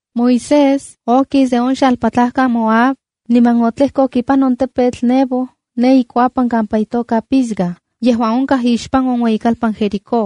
Moisés okis de on xalpatlajkan Moab niman otlejkok ipan on tepetl Nebo ne ikuapan kampa itoka Pisga, yejuan onkaj ixpan on ueyikalpan Jericó.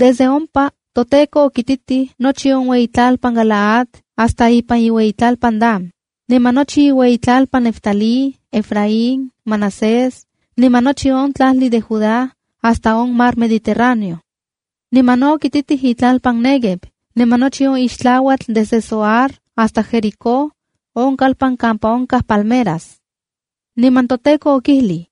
Desde ompa, toTEKO okititij nochi on iueyitlalpan Galaad hasta ipan iueyitlalpan Dan, niman nochi inueyitlalpanuan Neftalí, Efraín, Manasés niman nochi on tlajli de Judá hasta on Mar Mediterráneo. Niman no okititij itlalpan Néguev, niman nochi on ixtlauatl desde Zoar hasta Jericó, on kalpan kampa onkaj palmeras. Niman toTEKO okijlij: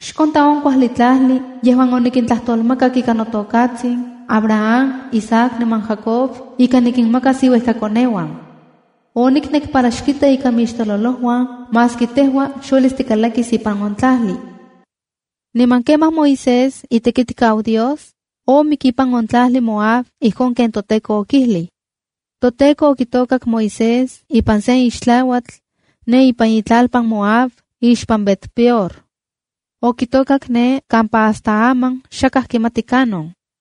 “Xkonta on kuajli tlajli yejuan onikintlajtolmakak ika notokatsin Abraham, Isaac niman Jacob ika nikinmakas inuejkakoneuan. Oniknek para xkita ika mixtololojuan maski tejua xuelis tikalakis ipan on tlajli.” Niman kemaj Moisés, itekitkau Dios, omik ipan on tlajli Moab ijkon ken toTEKO okijlij. ToTEKO okitokak Moisés ipan sen ixtlauatl ne ipan itlalpan Moab, ixpan Bet-peor. Okitokak ne kampa hasta aman xakaj kimati kanon.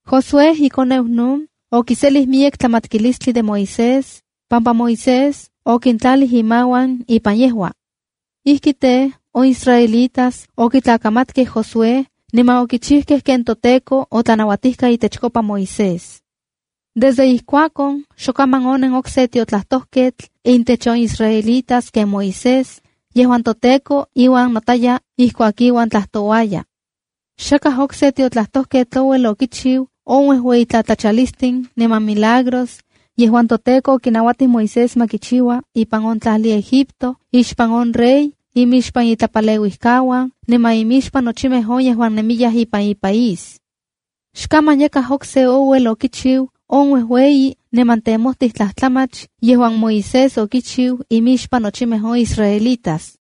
Josué, ikoneu Nun, okiselij miyek tlamatkilistli de Moisés, pampa Moisés okintlalij imauan ipan yejua. Ijki tej, on israelitas okitlakamatkej Josué niman okichijkej ken toTEKO otlanauatijka itechkopa Moisés. Desde ijkuakon, xokaman onen okse tiotlajtojketl intech on israelitas ken Moisés, yejuan toTEKO iuan notayaj ijkuak iuan tlajtouaya. Xakaj okse tiotlajtojketl ouel okichiu on uejueyi tlatlachalistin niman milagros yejuan toTEKO okinauatij Moisés ma kichiua ipan on tlajli Egipto ixpan on rey, imixpan itlapaleuijkauan niman imixpan nochimej on yejuan nemiyaj ipan ipaís. Xkaman yakaj okse ouel okichiu on uejueyi niman temojtij tlajtlamach yejuan Moisés okichiu imixpan nochimej on israelitas.